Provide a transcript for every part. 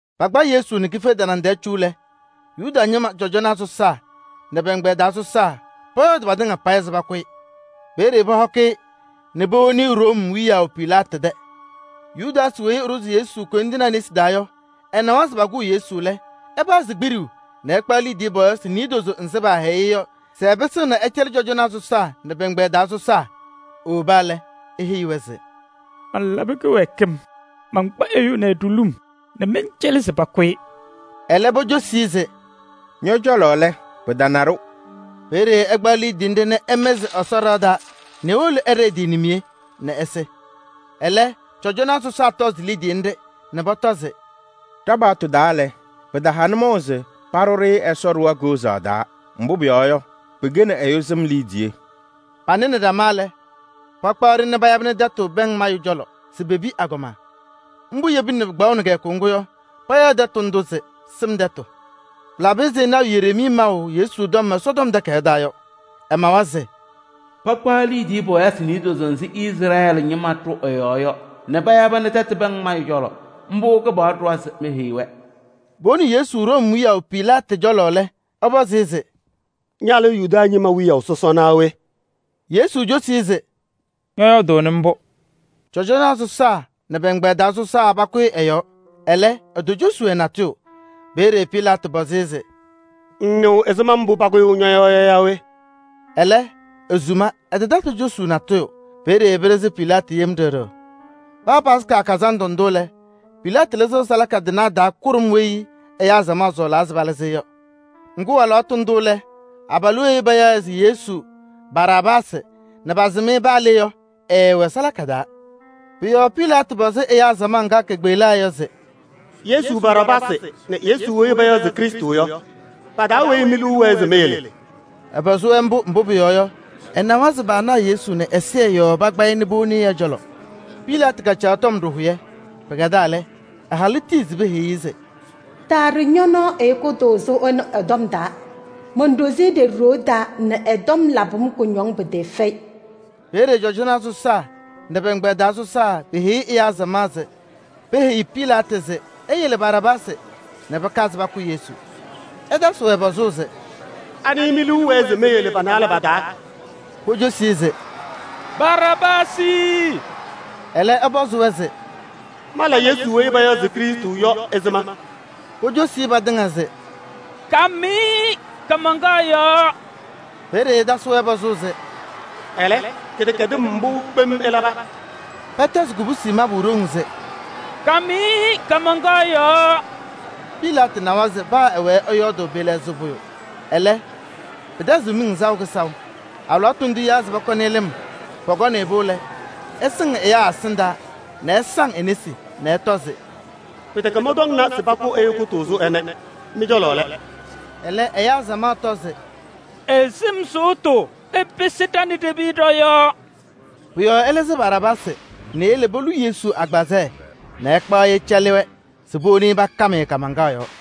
Pakpa Yesu nɛ kife tanaŋ tɛɛ cu lɛ, Yuda ñɩma cɔjɔnaa sɔsaa nɛ pɛ-ɛgbɛyɛ taa sɔsaa pɔyɔɔdɩ patɩŋa payɩ se pakʋ-ɩ. Peeye pɔhɔkɩ-ɩ nɛ powoni-i Room wiyaʋ Pilaatɩ tɛ. Yudaasɩ weyi ɛɖʋzɩ Yesu koyindinaa nesi taa yɔ, ɛnawa se pakʋʋ Yesu lɛ, ɛpazɩ kpiɖuu nɛ ɛkpaɣ liidiye pɔɔyɩsɩ niidozo nzɩ paahɛyɩ-ɩ yɔ se ɛpɩsɩɣna ɛcɛlɩ cɔjɔnaa sɔsaa nɛ pɛ-ɛgbɛyɛ taa sɔsaa. Ewoba lɛ, eheyi-wɛ se: “Malabɩ kɩwɛɛkɩm: mankpa ɛyʋ ɛnɛ ɖulum nɛ mɛncɛlɩ se pakʋ-ɩ.” Ɛlɛ pocosi-i se: “Ñɔ-cɔlɔ lɛ! Pɩtana-ɖʋ.” Peeye ɛkpaɣ liidiye nɖɩ nɛ ɛmɩzɩ Ɛsɔ ɖɩɣa taa nɛ ewolo ɛɖɩ ɛ-tɩ nimiye nɛ ɛsɩ. Ɛlɛ, cɔjɔnaa sɔsaa tɔzɩ liidiye nɖɩ nɛ pɔtɔ se: “Ɖa-paɣtʋ taa lɛ, pɩtaha nʋmɔʋ se paɖʋ-ɖɩ Ɛsɔ ɖɩɣa koozaɣ taa, mbʋ pʋyɔɔ yɔ, pɩkɛnɩ ɛyʋ sɩm liidiye.” Panɩnɩ ɖama lɛ, pakpaɣ-ɖɩ nɛ payabɩnɩ tɛtʋ pɛŋ mayʋ cɔlɔ se pepi agɔma. Mbʋ yebina nɛ pɩkpaɣʋnɩ kɩyakʋ ŋgʋ yɔ, payaɣ tɛtʋ ndʋ se: “Sɩm Tɛtʋ.” Pɩlabɩ ɛzɩ lɔɔyaɣ tʋ Yereemii maʋ Yesu tɔm Ɛsɔtɔm Takayaɣ taa yɔ. Ɛmawa se: “Pakpaɣ liidiye pɔɔyɩsɩ niidozo nzɩ Izrɛɛlɩ ñɩma ɖʋ ɛ-yɔɔ yɔ nɛ payabɩnɩ tɛtʋ pɛŋ mayʋ cɔlɔ. Mbʋ Kɩpaɣlʋ kaɖʋwa se mala.” Powoni Yesu Room wiyaʋ Pilaatɩ cɔlɔ lɛ, ɛpɔzɩ-ɩ se: “Ña lɛ Yuda ñɩma wiyaʋ sɔsɔ naa we?” Yesu cosi-i se: “Ñɔyɔɔdʋʋnɩ mbʋ.” Cɔjɔnaa sɔsaa nɛ pɛ-ɛgbɛyɛ taa sɔsaa pakʋyɩ ɛ-yɔɔ, ɛlɛ, etocosi-wɛ natʋyʋ. Peeye Pilaatɩ pɔzɩ-ɩ se: “Ŋŋnɩɣ ɛzɩma mbʋ pakʋyʋʋ ñɔ-yɔɔ yɔ yaa we?” Ɛlɛ, esuma, ɛtatasɩ cosuu natʋyʋ. Peeye pɩɖɩɣzɩ Pilaatɩ yem ɖɩɣ ɖɩɣ. Paa Yomiye Taa Lɩʋ Kazandʋ ndʋ lɛ, Pilaatɩ lɩzɩɣ salaka tɩnaa taa kʋɖʋm weyi ɛyaa samaɣ sɔɔlaa se palɩzɩ-ɩ yɔ. Ŋgʋ, alɩwaatʋ ndʋ lɛ, abalʋ weyi payaɣ se [Yesu] Baraabaasɩ nɛ pasɩm-ɩ paa le yɔ, ɛɛwɛ salaka taa. Pʋ-yɔɔ Pilaatɩ pɔzɩ ɛyaa samaɣ ŋga kekpeɣlaa yɔ se: “[Yesu] Baraabaasɩ nɛ Yesu weyi payaɣ se Krɩstʋ yɔ, pa-taa weyi mi-liu wɛɛ se meyele?” Ɛpɔzɩ-wɛ mbʋ, mbʋ pʋyɔɔ yɔ, ɛnawa se paanaɣ Yesu nɛ ɛzɩyɛ yɔɔ pakpa-ɩ nɛ powoni ɛ-cɔlɔ. Pilaatɩ kacaɣ tɔm ɖɩhʋyɛ. Pɩkɛdaa lɛ, ɛ-halʋ tiyi se peheyi-i se: “Taaɖʋ ñɔ-nɔɔ ɛyʋ kʋtʋʋzʋ ɛnʋ ɛ-tɔm taa. Monɖozi-i ɖeɖe ɖoo taa nɛ ɛ-tɔm labɩ-m kʋñɔŋ pɩtɩɩfɛyɩ.” Peeye cɔjɔnaa sɔsaa nɛ pɛ-ɛgbɛyɛ taa sɔsaa peheyi ɛyaa samaɣ se keheyi Pilaatɩ se eyele Baraabaasɩ nɛ pɩkazɩ pakʋ Yesu. Ɛtasɩ-wɛ pɔzʋʋ se: “Anɩ mi-liu wɛɛ se meyele pa-naalɛ pa-taa?” Pocosi-i se: “Baraabaasɩ!” Ɛlɛ ɛpɔzɩ-wɛ se: “Mala Yesu weyi payaɣ se Krɩstʋ yɔ ɛzɩma?” Pocosi-i patɩŋa se: “Kam-ɩ kaamaŋkaɣ yɔɔ!” Peeye ɛtasɩ-wɛ pɔzʋʋ se: “Ɛlɛ, kɩdɛkɛdɩm mbʋ kpem ɛlaba?” Pɛtɛzɩ kobusi mabʋ ɖoŋ se: “Kam-ɩ kaamaŋkaɣ yɔɔ!” Pilaatɩ nawa se paa ɛwɛɛ ɛyɔɔdʋʋ, pɩɩlɛɣzɩɣ pʋyʋ, Ɛlɛ, pɩtɛzɩɣ miŋ saʋ kɩsaʋ. Alɩwaatʋ ndʋʋ etiyaa se pɔkɔnɩ-ɩ lɩm. Pɔkɔnɩ-pʋ lɛ, ɛsɩŋ ɛyaa ɛsɩndaa nɛ ɛsaŋ e-nesi nɛ ɛtɔ se: “Pɩtɛkɛ mɔntɔmna se pakʋ ɛyʋ kʋtʋʋzʋ ɛnɛ! Mɩ-cɔlɔ lɛ!” Ɛlɛ ɛyaa samaɣ tɔ se: “Ɛ-sɩm sʋʋtʋ ɛpɩsɩ ɖa nɛ ɖe-piya ɖɔ-yɔɔ!” Pʋ-yɔɔ ɛlɩzɩ Baraabaasɩ nɛ eyele polu Yesu agbazɛɛ nɛ ɛkpaɣ-ɩ ɛcɛlɩ-wɛ se powoni-i pakam-ɩ kaamaŋkaɣ yɔɔ.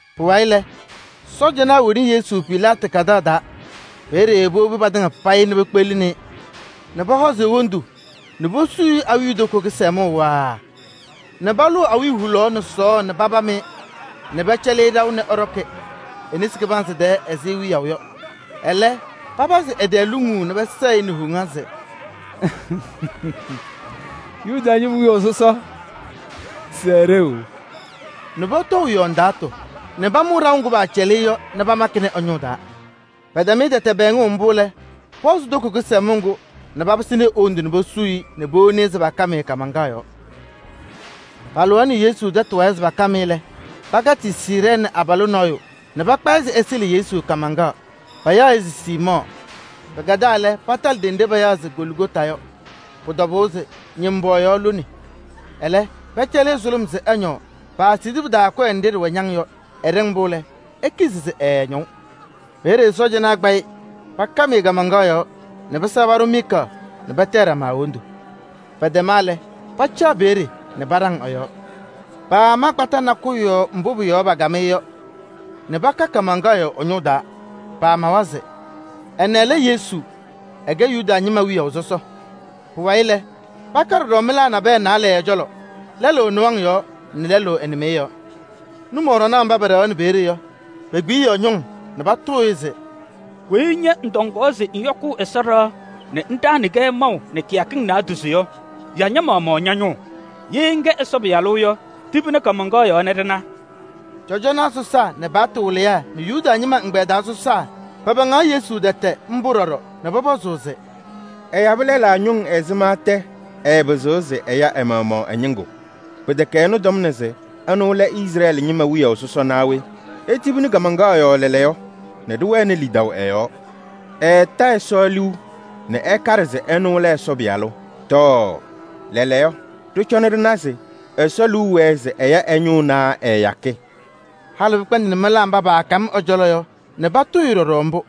Pʋwayɩ lɛ, sɔɔjanaa woni Yesu Pilaatɩ tɛ kadaɣ taa. Peeye powobi patɩŋa payɩ nɛ pekpeɣlini-i nɛ pɔhɔzɩ e-wondu nɛ posuu-i awiitoko kɩsɛmʋʋ waaa nɛ palʋʋ awiya hulaɣ nɛ sɔɔɔ nɛ papam-ɩ nɛ pɛcɛlɩ-ɩ ɖaʋ nɛ ɛɖɔkɩ e-nesi kɩbanzɩ taa ɛzɩ wiyaʋ yɔ. Ɛlɛ papazɩ ɛ-tɛɛ luŋuu nɛ pɛsɛɣ-ɩ nɛ woŋa se: “Yuda ñɩma wiyaʋ sɔsɔ! Sɛɛ ɖeu!” Nɛ pɔtɔʋ ɛ-yɔɔ ndaatʋ nɛ pamʋʋ ɖaʋ ŋgʋ paacɛlɩ-ɩ yɔ nɛ pamakɩ ɛ-ñʋʋ taa. Pɛtɛm-ɩ tɛtɛ pɛɛŋʋʋ mbʋ lɛ, pɔhɔzɩ toko kɩsɛmʋʋ ŋgʋ nɛ papɩsɩnɩ e-wondu posuu-i nɛ powoni-i se pakam-ɩ kaamaŋkaɣ yɔɔ. Palɩɣaɣnɩ Yesu tɛtʋ wayɩ se pakam-ɩ lɛ, pakatɩ Siirɛɛnɩ abalʋ nɔɔyʋ nɛ pakpa-ɩ se ɛsɩɣlɩ Yesu kaamaŋkaɣ, payaɣ-ɩ se Siimɔɔ. Pɩkɛdaa lɛ, patalɩ ɖenɖe payaɣ se Goligota yɔ, pʋ-tɔbʋʋ se ñʋmbɔɔyaɣ lone. Ɛlɛ pɛcɛlɩ-ɩ sʋlʋm se ɛñɔɔ, paasidi pɩ-taa kɔyɛ nɖɩ ɖɩwɛ ñaŋ yɔ. Ɛɖɩŋ-pʋ lɛ, ekizi se ɛɛñɔʋ. Peeye sɔɔjanaa kpa-ɩ pakam-ɩ kaamaŋkaɣ yɔɔ nɛ pɩsɛɣ paɖʋ miika nɛ patayɩ ɖama e-wondu. Pɛtɛma lɛ, pacaɣ peeye nɛ paɖaŋ ɛ-yɔɔ. Paama kpata nakʋyʋ yɔɔ mbʋ pʋ-yɔɔ pakam-ɩ yɔ nɛ paka kaamaŋkaɣ yɔɔ ɛ-ñʋʋ taa. Pamawa se: “Ɛnɛ lɛ Yesu weyi ɛkɛ Yuda ñɩma wiyaʋ sɔsɔ yɔ.” Pʋwayɩ lɛ, paka ɖɔɖɔ mɩlaa naalɛ nabɛyɛ ɛ-cɔlɔ: lɛlʋ ɛ-nɩwaŋ yɔɔ nɛ lɛlʋ ɛ-nɩmɩyɛ yɔɔ. Nʋmɔɖɔnaa mba pɛɖɛɣaɣnɩ peeye yɔ, pekpiɣyiɣ ñʋŋ nɛ patʋʋ-ɩ se: “Weyi ña ŋtɔŋaɣ se ŋyɔkʋʋ Ɛsɔ ɖɩɣa nɛ ŋɖaɣnɩ-kɛ maʋ nɛ kɩyakɩŋ naadozo yɔ, ya ña-maɣmaɣ ña-ñʋʋ! Ye ŋkɛ Ɛsɔ Pɩyalʋ yɔ, tibini kaamaŋkaɣ yɔɔ nɛ ɖɩna!” Cɔjɔnaa sɔsaa nɛ paɣtʋ wɩlɩyaa nɛ Yuda ñɩma ɛgbɛyɛ taa sɔsaa pɛpɛɛŋaɣ Yesu tɛtɛ mbʋ ɖɔɖɔ nɛ pɔpɔzʋʋ se: “Ɛyabɩ lɛlaa ñʋŋ ɛzɩma tɛ, ɛɛpɩzɩɣ se ɛya ɛ-maɣmaɣ ɛ-ñɩŋgʋ! Pɩtɛkɛ ɛnʋ tɔmna se ɛnʋ lɛ Izrɛɛlɩ ñɩma wiyaʋ sɔsɔ naa we? Etibini kaamaŋkaɣ yɔɔ lɛɛlɛɛyɔ nɛ ɖɩwɛnɩ lidaʋ ɛ-yɔɔ! Ɛɛta Ɛsɔ liu nɛ ɛkaɖɩ se ɛnʋ lɛ Ɛsɔ Pɩyalʋ. Tɔɔ! Lɛɛlɛɛyɔ, ɖɩcɔna ɖɩna se Ɛsɔ liu wɛɛ se ɛya ɛ-ñʋʋ naa ɛɛyakɩ?” Halɩ pɩkpɛndɩnɩ mɩlaa mba paakam ɛ-cɔlɔ yɔ nɛ patʋʋ-ɩ ɖɔɖɔ mbʋ.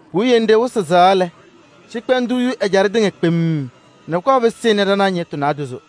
Puwiye nɖɩ wɩsɩ siɣa lɛ, cɩkpɛndʋʋ yu ɛjaɖɛ tɩŋa kpemm nɛ pʋkɔɔ pɩsɩnɩ ɖanaɣ ñɩɣtʋ naadozo.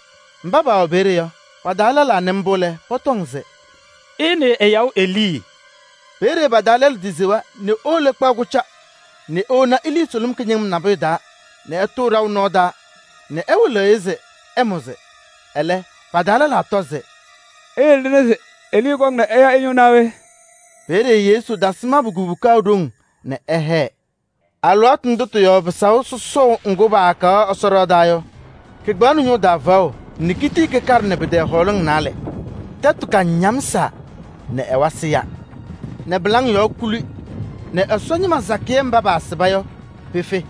Mba paawɛ peeye yɔ, pa-taa lɛlaa nɩ mbʋ lɛ, pɔtɔŋ se: “Ɩnɩɩ ɛyaɣʋ Elii!” Peeye pa-taa lɛlʋ tisewa nɛ ewolo ɛkpaɣ kʋca nɛ ewona elii sʋlʋm kɩñɩŋɩm nabʋyʋ taa nɛ ɛtʋʋ ɖaʋ nɔɔ taa nɛ ɛwɩlɩɣ-ɩ se ɛmʋzɩ. Ɛlɛ, pa-taa lɛlaa tɔ se: “Iyele ɖɩna se Elii kɔŋ nɛ ɛya ɛ-ñʋʋ naa we?” Peeye Yesu tasɩ mabʋ kubuka ɖoŋ nɛ ɛhɛɛ. Alɩwaatʋ ndʋ tɩ-yɔɔ pɩsaʋ sɔsɔʋ ŋgʋ paakaɣ Ɛsɔ ɖɩɣa taa yɔ, kɩkpaɣnɩ ñʋʋ taa faɣʋ nɛ kitii kɩkaɖɩnɩ pɩ-tɛɛ hɔɔlɩŋ naalɛ. Tɛtʋ kañamsaa nɛ ɛwasɩ ya nɛ pɩlaŋ yɔɔ kuli nɛ Ɛsɔ ñɩma sakɩyɛ mba paasɩba yɔ, pefe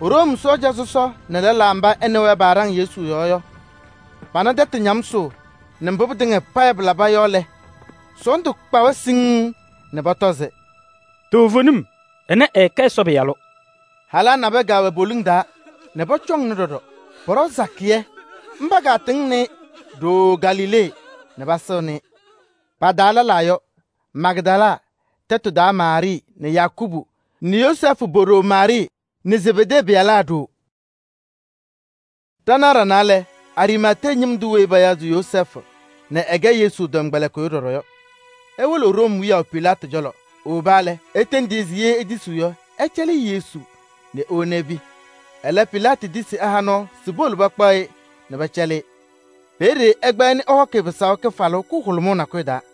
Room sɔɔja sɔsɔ nɛ lɛlaa mba ɛ nɛ wɛ paaɖaŋ Yesu yɔɔ yɔ, pana tɛtʋ ñamsʋʋ nɛ mbʋ pɩtɩŋa payɩ pɩlabɩ mbʋ yɔ lɛ, sɔɔndʋ kpa-wɛ siŋŋ nɛ pɔtɔ se: “Toovenim, ɛnɛ ɛɛkɛ Ɛsɔ Pɩyalʋ!” Halaa nabɛyɛ kɛwɛ poliŋ taa nɛ pɔcɔŋnɩ ɖɔɖɔ, pɔɖɔ sakɩyɛ. Mba katɩŋnɩ-ɩ nɛ ɖooo Galilee nɛ pasɩŋnɩ-ɩ. Pa-taa lɛlaa yɔ: Magdala tɛtʋ taa Maarɩɩ nɛ Yakubu nɛ Yozɛɛfʋ po-ɖoo Maarɩɩ nɛ Zebedee pɩyalaa ɖoo. Ɖanaɣ ɖanaa lɛ, Ariimatee ñɩm tʋ weyi payaɣ se Yozɛɛfʋ nɛ ɛkɛ Yesu tɔmkpɛlɩkɩyʋ ɖɔɖɔ yɔ, ewolo Room wiyaʋ Pilaatɩ cɔlɔ. Ewoba lɛ, etendi-i se ye etisiɣ yɔ, ɛcɛlɩ-ɩ Yesu nɛ ewona epi. Ɛlɛ Pilaatɩ tisi nɛ ɛha nɔɔ se powolo pakpaɣ-ɩ nɛ pɛcɛlɩ-ɩ. Peeye ɛkpaɣ-ɩ nɛ ɛhɔkɩ-ɩ pɩsaʋ kɩfalʋʋ kʋhʋlʋmʋʋ nakʋyʋ taa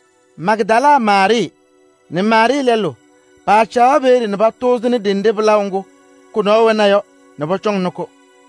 Magdala Maarɩɩ nɛ Maarɩɩ lɛlʋ paacaɣ peeye nɛ patʋʋzɩnɩ ɖenɖe pɩlaʋ ŋgʋ kʋ-nɔɔ wɛna yɔ nɛ pɔcɔŋnɩ-kʋ.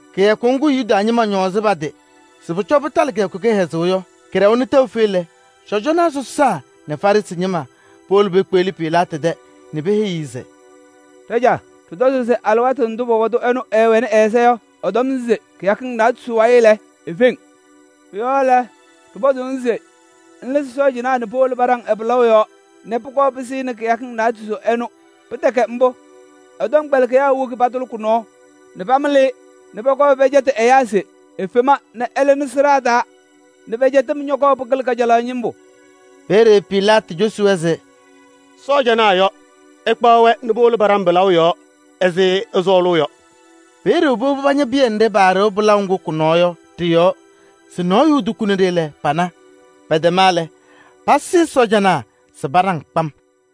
Kɩyakʋ ŋgʋ Yuda ñɩma ñɔɔzʋʋ pa-tɩ se pʋcɔ pɩtalɩ kɩyakʋ kɩhɛzʋʋ yɔ, kɩɖɛwa nɛ tɛʋ fe lɛ, cɔjɔnaa sɔsaa nɛ Farɩsɩ ñɩma powolo pekpeɣli Pilaatɩ tɛ nɛ peheyi-i se: “Ɖajaa! Ɖɩtɔzʋʋ se alɩwaatʋ ndʋ pɔbɔtʋ ɛnɛ ɛɛwɛnɩ ɛ-ɛza yɔ, ɛtɔm se kɩyakɩŋ naadozo wayɩ lɛ, efeŋ. Pʋ-yɔɔ lɛ, ɖɩpɔzʋʋ-ŋ se ŋlɩzɩ sɔɔjanaa nɛ powolo paɖaŋ ɛ-pɩlaʋ yɔɔ nɛ pʋkɔɔ pɩsɩnɩ kɩyakɩŋ naadozo ɩnʋ. Pɩtɛkɛ mbʋ, ɛ-tɔmkpɛlɩkɩyaa woki patʋlɩ kʋ-nɔɔ nɛ pamɩlɩ-ɩ nɛ pɔkɔɔ pɛcɛtɩ ɛyaa se efema nɛ ɛlɩnɩ sɩɖaa taa nɛ pɛ-cɛtɩm ñɔkɔɔ pɩkɩlɩ kajalaɣ ñɩmbʋ.” Peeye Pilaatɩ cosi-wɛ se: “Sɔɔjanaa yɔ! Ɩkpaɣ-wɛ nɛ powolo paɖaŋ pɩlaʋ yɔɔ ɛzɩ ɩsɔɔlʋʋ yɔ.” Peeye powobi pañɩ pɩyɛ nɖɩ paɖɩɣ pɩlaʋ ŋgʋ kʋ-nɔɔ yɔ ɖɩ-yɔɔ se nɔɔyʋ etukuni-ɖɩ lɛ, pana. Pɛtɛma lɛ, pasɩɩ sɔɔjanaa se paɖaŋ kpam.